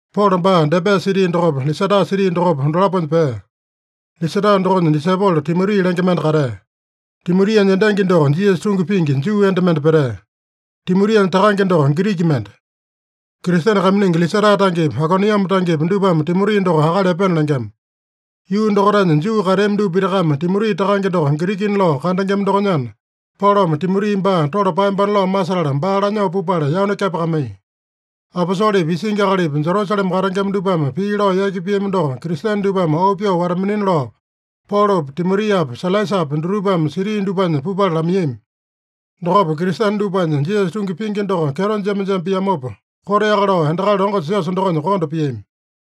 Polo baa Debe siti dokopa, Lisata siti dokopa, dolaponya pea. Lisata dokonya disaipolo Timoti lenge mende katea. Timotianya endangi doko Jisasa tungi pingi Juu enda mende petea. Timotianya takange doko Giriki mende. Kristene kaiminingi Lisata tangepi, Aikoniame tangepi dupame Timoti doko akali epena lengema. Yuu dokaitanya Juu kateami dupa pitakame Timoti takange doko Girikina lao kandengema dokonyana, Polome Timoti baa tole paeyambana lao masetala, baa lanyoo pupala yanu kepakamaiya. Aposolepi, isingi akalipi, Jerusalema katengema dupame pii lao yaki piami doko Kristene dupame auu pyoo wata-minina lao, Polopi, Timotiapi, Sailasapi dutupame siti dupanya pupala lamaiyami. Dokopa, Kristene dupanya Jisasa tungi pingi doko kyeto jema-jema piamopa, koteaka lao endakali longo siosa dokonya konda piami.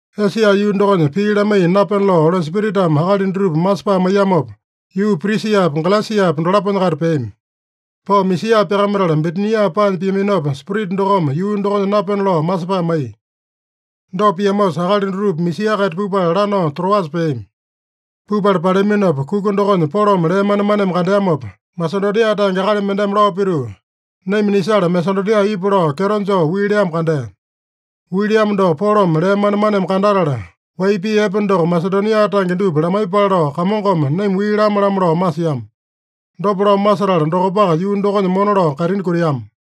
Esia yuu dokonya pii lamaiya napena lao Oli Spiritame akali dutupa masepae maiyamopa, yuu Prisiapa, Galesiapa dolaponya-kaita peami. Pao Misia pyakamatala, Bitinia paanya piaminopa, Spirita dokome yuu dokonya napena lao masepae maiya. Dopa piamosa, akali dutupa Misia-kaita pupala, lanao Troasa peami. Pupala paleaminopa, kuka dokonya Polome lee manemaneme kandeamopa, Masedonia tange akali mendeme lao pituu, “Naima nisala Masedonia ipu” lao kyeto joo wii leamo kandea. Wii leamo doko Polome lee manemaneme kandatala, wai pii epe doko Masedonia tange dupa lamaiyepale lao, Kamongome naima wii lame-lamo lao masiama. Dopa lao masetala dokopaka yuu dokonya mona lao kaitini kutiama.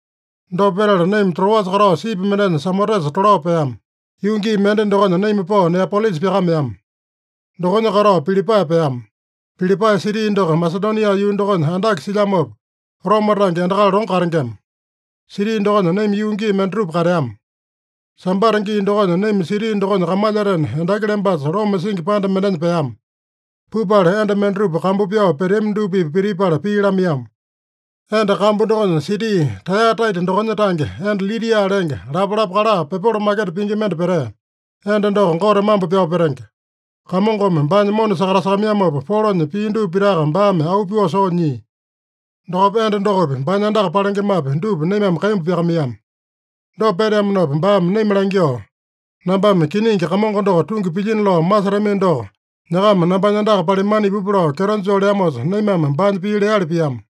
Dopa petala naima Troasa katao sipi mendenya Samotesa tolao peama. Yuu gii mende dokonya naima pao Neapolisa pyakameama. Dokonya katao Pilipae peama. Pilipae siti doko Masedonia yuu dokonya andake silyamopa, Roma tange endakali longo katengema. Siti dokonya naima yuu gii mendatupa kateama. Sambata gii dokonya naima siti dokonya kamalyatena, endaki lembasa loma singi panda mendenya peama. Pupala, enda mendatupa kambu pyao peteami dupa-pipa pitipala pii lamaiyama. Enda kambu dokonya, siti Taeyataita dokonya tange enda Lidia lenge, lapalapa kala pepolo maketa pingi mende petea. Enda doko Gote mambo pyao petenge. Kamongome baanya mona sakatasakamaiyamopa, Polonya pii dupa pitaka baame auu pyoo soo nyia. Dokopa enda dokopi, baanya andaka palengemapi, dupa naimame kaimbu pyakamaiyama. Dopa peteamanopa baame naima langyoo, “Nambame kiningi Kamongo doko tungi pilyino lao masetamino doko, nyakama nambanya andaka palimana ipupa” lao kyeto joo leamosa, naimame baanya pii leali piama.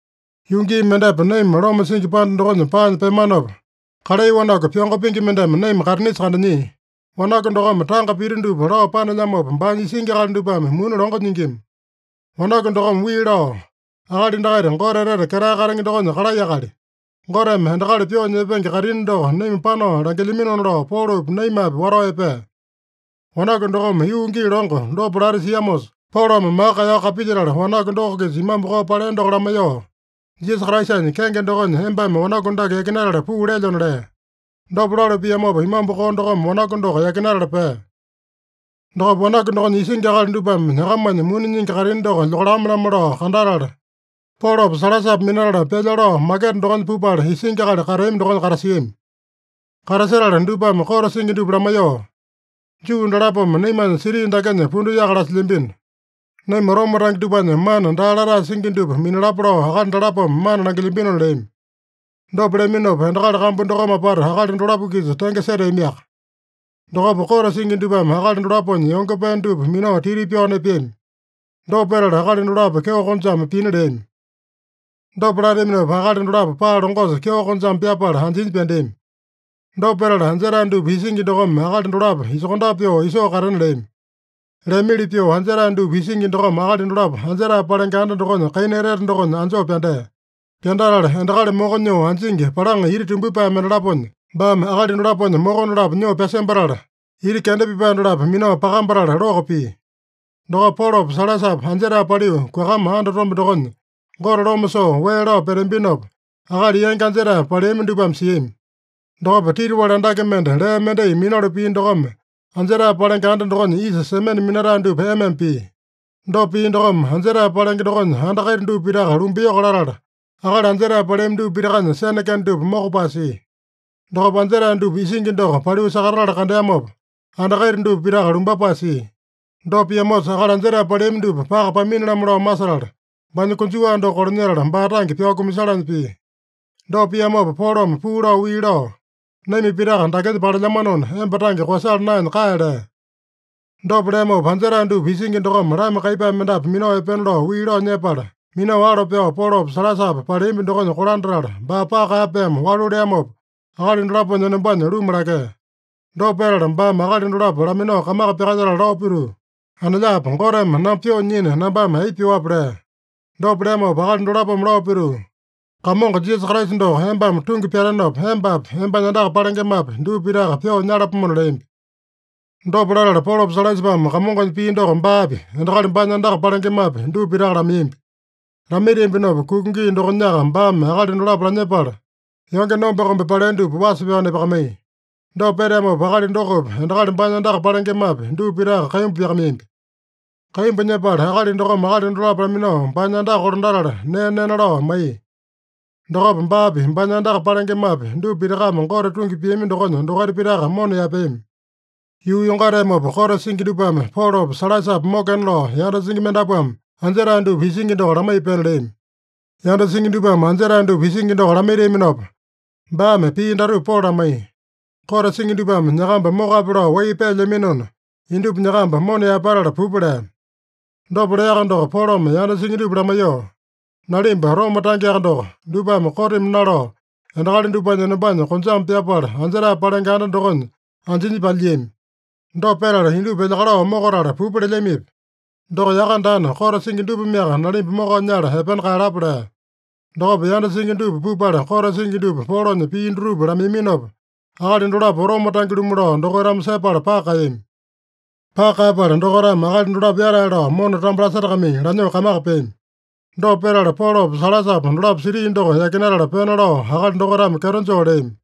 Yuu gii mendepa naima loma singi panda dokonya paanya peamanopa, kalai wanaku, pyongo pingi mendeme naima kaitinisa kandanyia. Wanaku dokome tanga pita dupa lao panelyamopa, baanya isingi akali dupame muni longo nyingima. Wanaku dokome wii lao, “Akali dakaita Gote Etete Ketae Katenge dokonya kalai akali. Goteme endakali pyoo nyepenge kaitini doko naima panao langilyaminona” lao Polopi, naimapi watao epea. Wanaku dokome yuu gii longo dopa lati siamosa, Polome maka kaeyao kapilyetala, wanaku doko-kisa imambu koo palea doko lamaiyoo, “Jisasa Kraisanya kenge dokonya embame wanaku dake yakinatala puu lelyona” lea. Dopa lalu piamopa, imambu koo dokome wanaku doko yakinatala pea. Dokopa wanaku dokonya isingi akali dupame nyakamanya muni nyingi kaitini doko lyokalame-lamo lao kandatala, Polopa Sailasapa minatala, pyalya lao maketa dokonya pupala, isingi akali kateami dokonya katasiami. Katasetala dupame kote singi dupa lamaiyoo, “Juu dalapome naimanya siti dakenya pundu yaka lasilyambino. Naima Roma tange dupanya mana daa latae singi dupa minalapa lao akali dalapome mana langilyambinona” leami. Dopa leaminopa, endakali kambu dokome apata akali dolapo-kisa tenge seteamiaka. Dokopa kote singi dupame akali dolaponya yonge pee dupa minao titi pyao nepeami. Dopa petala, akali dolapo kyeo konjame pina leami. Dopa lateaminopa, akali dolapo paa longosa kyeo konjame pyapala anjinya pyandeami. Dopa petala, anjetae dupa isingi dokome akali dolapo isokondape pyoo isoo katena leami. Leamili pyoo, anjetae dupa isingi dokome akali dolapo anjetae palenge anda dokonya kaina etete dokonya anjoo pyandea. Pyandatala endakali moko nyoo anjingi palaŋa ita tumbyepae mendalaponya, baame akali dolaponya moko dolapo nyoo pyasembatala, ita kenda pipae dolapo minao pakambatala loko pia. Dokopa Polopa Sailasapa anjetae paliu, kuakama andatombe dokonya, Gote loma soo wee lao peteambinopa, akali yangi anjetae paleami dupame siami. Dokopa titiwali andake mende lee mendai minalu pia dokome, anjetae palenge anda dokonya isa semene minatae dupa ema-ema pia. Dopa pia dokome, anjetae palenge dokonya anda kaita dupa pitaka lumbayoko latala, akali anjetae paleami dupa pitakanya sene kende dupa mokopae sia. Dokopa anjetae dupa isingi doko paliu sakatatala kandeamopa, anda kaita dupa pitaka lumbapae sia. Dopa piamosa, akali anjetae paleami dupa paka pamini-lamo lao masetala, baanya konjuwa doko kolanyetala, baa tange pyao kumasalanya pia. Dopa piamopa Polome puu lao wii lao, “Naima pitaka dakenya palelyamanona, emba tange koeyasala naenya kae” lea. Dopa leamopa, anjetae dupa isingi dokome lama kaiyepae mendapu minao epena lao wii lao nyepala, minao alo pyao, Polopa Sailasapa paleambi dokonya kolandatala, baa paka kaeyapaeme walu leamopa, akali dolaponya enombanya luma lakea. Dopa petala baame akali dolapo laminao kamaka pyakalyetala lao pituu, “Anelyapo, Goteme namba pyoo nyina, nambame aipa pyuape?” lea. Dopa leamopa akali dolapome lao pituu, “Kamongo Jisasa Kraisa doko embame tungi pyatenopa, embapi, embanya andaka palengemapi, dupa pitaka pyoo nyalapomona” leambi. Dopa latala Polopa Sailasapame Kamongonya pii doko baapi, endakali baanya andaka palengemapi, dupa pitaka lamaiyambi. Lamaitiambinopa, kuka gii dokonyaka baame akali dolapo lanyepala, yonge nombe-kombe palea dupa wasa pyao nepakamaiya. Dopa peteamopa, akali dokopi, endakali baanya andaka palengemapi, dupa pitaka kaimbu pyakamaiyambi. Kaimbu nyepala, akali dokome akali dolapo laminao baanya andaka kolandatala, nee nena lao maiya. Dokopa baapi, baanya andaka palengemapi, dupa pitakame Gote tungi piami dokonya dokaita pitaka mona yaepeami. Yuu yongateamopa, kote singi dupame Polopa Sailasapa mokena lao yanda singi mendapuame anjetae dupa isingi doko lamaiya pena leami. Yanda singi dupame anjetae dupa isingi doko lamaitiaminopa, baame pii datupa Polo lamaiya: “Kote singi dupame nyakamba mokape lao wai peelyaminona, indupa nyakamba mona yaepatala pupa” lea. Dopa leaka doko, Polome yanda singi dupa lamaiyoo, “Nalimba Roma tangeaka doko, dupame kotimi nalao, endakali dupanya enombanya konjame pyapala, anjetae palenge anda dokonya anjinya palyiami. Dopa petala, indupa elyakalao mokatala pupa lelyamipi? Doko yaka daana, kote singi dupameaka nalimba mokao nyala epena kaeyalapa” lea. Dokopa yanda singi dupa pupala, kote singi dupa Polonya pii dutupa lamaiyaminopa, akali dolapo Roma tange-lumu lao dokaitame sepala paka kaeyami. Paka kaeyapala, dokaitame akali dolapo yatae lao mona tambo lasetakamai, lanyoo kamaka peami. Dopa petala, Polopa Sailasapa dolapo siti doko yakinatala pena lao akali dokaitame kyeto joo leami.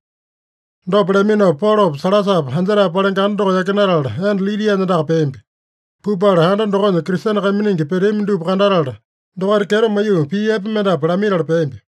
Dopa leaminopa, Polopa Sailasapa anjetae palenge anda doko yakinatala, enda Lidianya andaka peambi. Pupala anda dokonya Kristene kaiminingi peteami dupa kandatala, dokaita kyeto maiyoo pii epe mendapu lamaitala peambi.